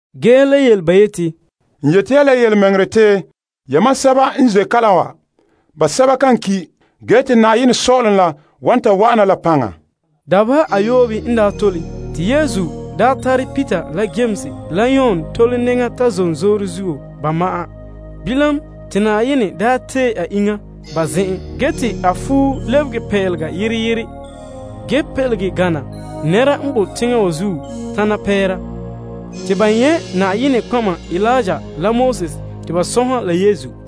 Ge Yesu le yele ba yeti, N yeti ya la yelemɛŋɛrɛ te yamam sɛba n ze' kala wa basɛba kan ki', ge te Yenɛ sɔ'ɔlom la wan ta wa'ana la paŋa. Dabeha ayoobe n daa tole, te Yesu tare Peter la Yames la Yon tole nɛŋa ta zom zoore zuo ba ma'an. Bilam, te Yenɛ daa tee Yesu ba zen'en. A fuo lɛbege pelega yere yere, pelege gana nɛra n bo teŋa wa zuo tana pɛɛra. Te ba nyɛ' Eliya la Moses te ba sɔnha la Yesu.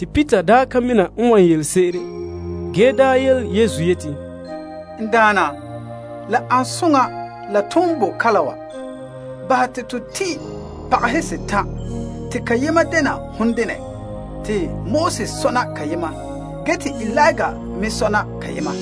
Peter yele Yesu yeti, Naa, la an soŋa la ton boe kalam wa. Bahɛ te to tin' pagahe setan' te kayema dɛna hon dene, te Moses sɔna kayema, ge te Eliya me sɔna kayema.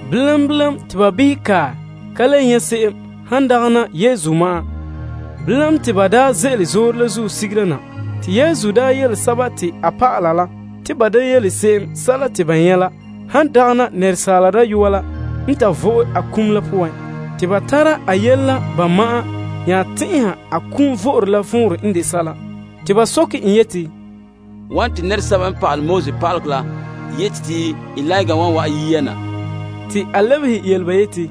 Bilam te ba behɛ kae, ka le nyɛ' se'em, han dagɛna Yesu ma'an. Te ban ze'ele zoore la zuo sigera na, Yesu yele ba yeti ba da yele se'em sɛla te ba nyɛ' la, han dagɛna Asaala Dayɔa la n ta vo'e a kum la poan. Ba tara a yele la ba ma'an nya tɛn'ɛha a kum vo'ore la vɔnrɛ n de sɛla. Te ba nya soke en yeti, Wane te pa'alegɔ pa'aleba la yeti te Eliya la wan wa'an yia na? Yesu lebehe ba yeti,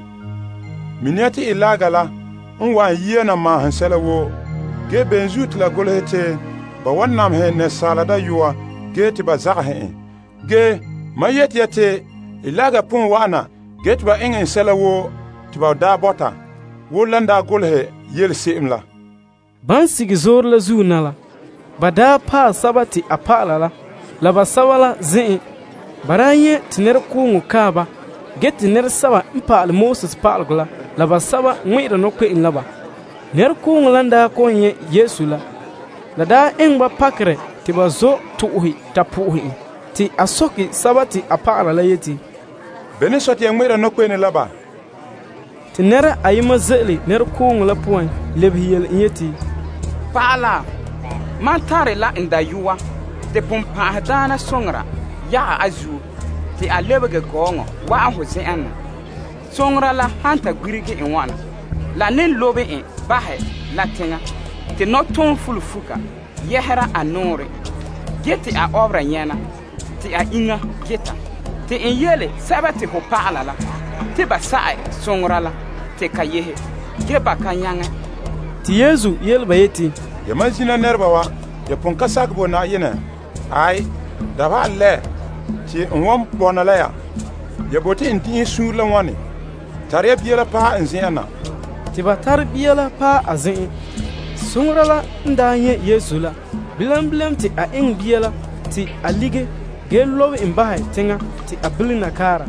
Mini ya te Eliya la n wa'an yia na maahom sɛla woo. Ge bene zuo te la golehe te ba wan namehɛ Asaala Dayɔa ge te ba zagahɛ en? Ge mam yeti ya te Eliya pon wa'ana ge te ba eŋɛ en sɛla woo te ba daa bɔta, wo lan daa golehɛ yele se'em la. Ban paɛ a dɔlɔba la basɛba la zen'en, ba nyɛ' te nɛrekooŋɔ kae ba, ge te pa'alegɔ pa'aleba la ŋmɛ'ɛra nɔkpe'ene la ba. Nɛrekooŋɔ la n kɔ'ɔn nyɛ' Yesu la, la daa eŋɛ ba pakerɛ te ba zɔ' to'ohe ta po'ohe en. A soke a dɔlɔba la yeti, Bene n sɔe te ya ŋmɛ'ɛra nɔkpe'ene la ba? Nɛra ayema ze'ele nɛrekooŋɔ la poan lebehe en yeti, Pa'ala, mam tare la n dayɔa te bonbe'a yagɛ a zuo te a lebehe gɔɔŋɔ, wa'an ho zen'en na. Bonbe'a la han ta gbirige n wana, la ne lobe en bahɛ la teŋa. Nɔtɔɔnrom fulunfuka yɛhera a nɔɔrɛn ge te a ɔbera nyɛna te a iŋa geta. N belom ho dɔlɔba la te ba sa'ɛ bonbe'a la te ka yehe, ge ba ka nyaŋɛ. Yesu yele ba yeti, Yamam zina nɛreba wa, ya pon ka sakɛ bo Na'ayenɛ! Dabeha a lɛ te n wan bɔna la ya? Ya bote n din'inhe suunre la wane? Tare ya bia la paɛ n zen'en na. Te ba tare bia la paɛ a zen'en. Bonbe'a la n nyɛ' Yesu la, bilam te a eŋɛ bia la te ka lige ge lobe en bahɛ teŋa te a bilena kaara,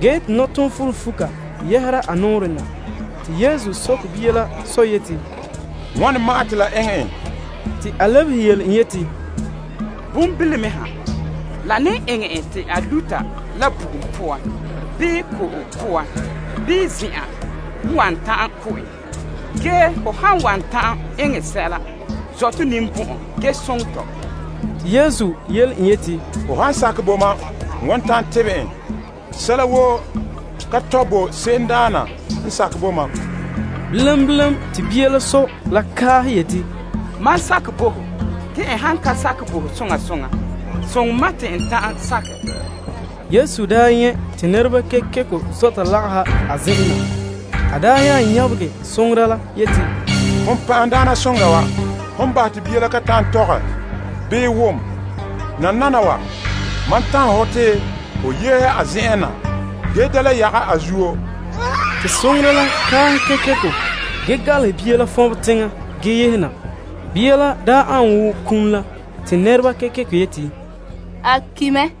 ge te nɔtɔɔnrom fulunfuka yɛhera a nɔɔrɛn na. Yesu soke bia la sɔ yeti, Wane ma'an te la eŋɛ en? Te a lebehe en yeti, Bonbilome ha. La ne eŋɛ en ta luta la bugum bii ko'om wan ta'an ko' en. Ge ho han wan ta'an eŋɛ sɛla, zɔ' to ninbɔn'ɔn ge soŋɛ tɔ. Yesu daa yele en yeti, Ho han sakɛ bo mam n wan ta'an tebɛ en. Sɛla woo ka tɔe bo se'emdaana n sakɛ bo mam. Bilam te bia la sɔ la kaahɛ yeti, Mam sakɛ bo ho! Soŋɛ mam te n ta'an sakɛ! Yesu n daa nyɛ' te nɛreba kekeko daa zɔta lagaha a zen'en na, a nyabegɛ bonbe'a la. A yeti, Bonbe'a wa, hon bahɛ te bia la kan ta'an tɔgɛ bii wom. Nananawa, mam tanhɛ hɔ te ho yehe a zen'en na ge da le yagɛ a zuo. Te bonbe'a la kaahɛ kekeko ge galehɛ bia la fɔnbɛ teŋa ge yehe na. Bia la daa an wo kum la te nɛreba kekeko yeti, A ki' mɛ.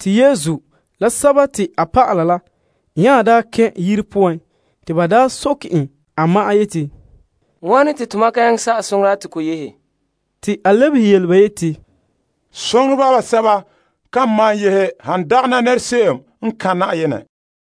Yesu la a dɔlɔba la n daa kɛn' yire poan, ba soke en a ma'an yeti, Wane te tomam ka nyaŋɛ sa'ɛ bonbe'a la te ko yehe? A lebehe ba yeti, Bonbe'a seto kan malom yehe han dagɛna se'em n so'ohɛre Yenɛ.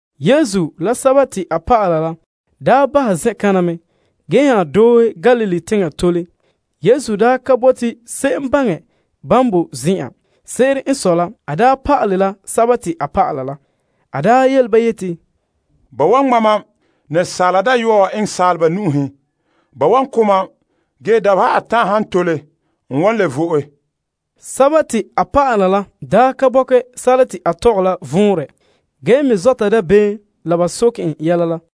Yesu la a dɔlɔba la daa bahɛ zen'kana mɛ, ge nya doohe Galilee teŋa tole. Yesu daa ka bote te se'em baŋɛ ban bo zen'en. Se'ere n sɔe la a daa pa'ale la a dɔlɔba la. A yele ba yeti, Ba wa ŋma' Asaala Dayɔa wa eŋɛ saaleba nu'uhen. Ba wan ko' em ge dabeha atan' han tole, a wan le vo'e. Ge a dɔlɔba la ka bɔkɛ sɛla te a tɔgɛ la vɔnrɛ ge me zɔta dabeem te ba soke en yɛla la.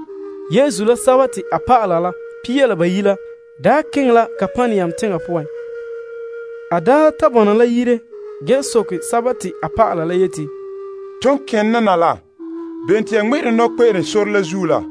Yesu la a dɔlɔba daa keŋɛ la Kapernaum teŋa poan. En daa ta bɔna la yire, a soke a ba la yeti, Bene te ya ŋmɛ'ɛra ne nɔkpe'ene sore la zuo la?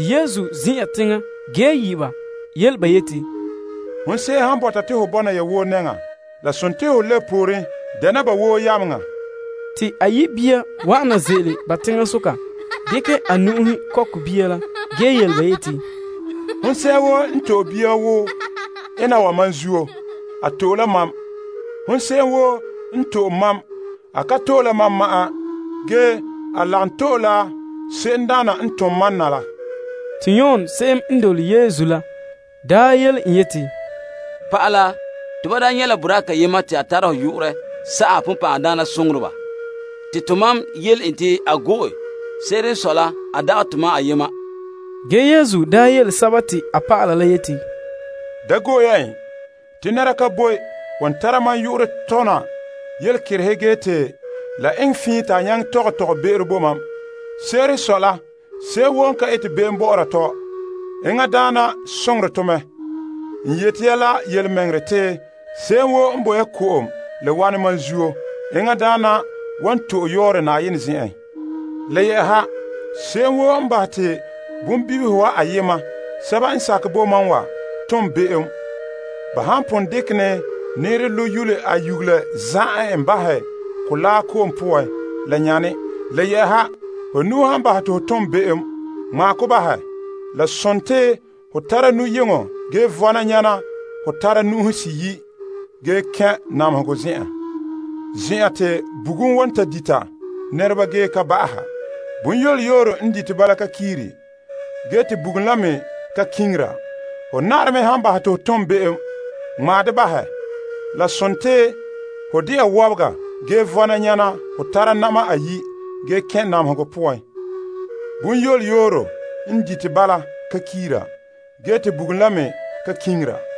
Yesu n zin'an teŋa ge yi' Pia La Bayi' yele ba yeti, Hon se'em han bɔta te ho bɔna ya woo nɛŋa, ho lebe pooren dɛna ba woo yameŋa. A yi' bia wa'an na ze'ele ba teŋasoka. En dekɛ a nu'uhe kɔkɛ bia la ge yele ba yeti, Hon se'em woo n to'e bia wo ena wa mam zuo, a to'e la mam. Hon se'em woo n to'e mam, a ka to'e la mam ma'an, ge a lagom to'e la se'emdaana n tom mam na la. Yon yele en yeti, Pa'ala, tomam daa nyɛ' la boraa kayema te a tara hon yu'urɛ sa'aha bonbɛ'ɛhe. Te tomam yele en te a go'e. Se'ere n sɔe la a dagɛ tomam ayema. Yesu yele en yeti, Da go'e ya en. Nɛra ka boe wan tara mam yu'urɛ tona yelekerehe ge te la eŋɛ fiin te a nyaŋɛ tɔgɛ tɔgɔbe'ero bo mam. Se'ere sɔe la se'em woo n ka ete be'em bɔ'ɔra tɔ, enŋadaana soŋorɛ to mɛ. N yeti ya la yelemɛŋɛrɛ, te se'em woo n bo ya ko'om la wanɛ mam zuo, enŋadaana wan to'e a yɔɔrɛ Yenɛ zen'en. Le yɛ'ɛha, se'em woo n bahɛ te bonbibihe ayema n sakɛ bo mam wa tom be'em, ba han pon dekɛ ne nɛɛrɛ lo' yule a nyugela za'ɛ se'em wa bahɛ mɔgɔrɛ ko'om poan, la nyane. Ho nu'o han bahɛ te ho tom be'em, ŋmaɛ ko bahɛ. La sontii ho tara nu'yeŋɔ ge vɔna nyana hon tare nu'uhe seyi' ge kɛn' namehegɔ zen'en, zen'an te bugum wan ta dita nɛreba ge ka ba'aha. Zunzuya n dite ba la ka kiiri, ge te bugum la me ka kiŋira. Ho na'arɛ me han bahɛ te ho tom be'em, ŋmaɛ de bahɛ. La sontii ho de'a wɔbega gee vɔna nyana hon tare na'ma ayi' ge kɛn' namehegɔ poan. Zunzuya n dite ba la ka kiiri, ge te bugum la me ka kiŋira.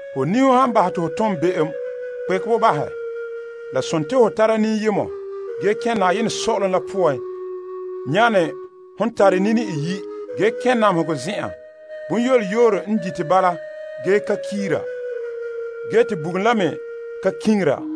Ho niho han bahɛ te ho tom be'em, kpekɛ bo bahɛ. La sontii ho tara niyemɔ ge kɛn' Yenɛ sɔ'ɔlom la poan nyana hon tare nini iyi', ge kɛn' namehegɔ zen'en. Zunzuya n dite ba la ka kiiri, ge te bugum la me ka kiŋira.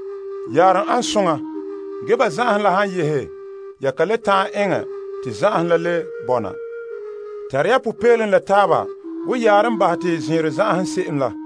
Yaarom ane soŋa, ge bo zan'anhom la han yehe, ya kan le ta'an eŋɛ te zan'anhom la le bɔna? Tare ya sunma'ahom la taaba wo yaarom bahɛ te zɛɛnrɔ zan'anhom se'em la.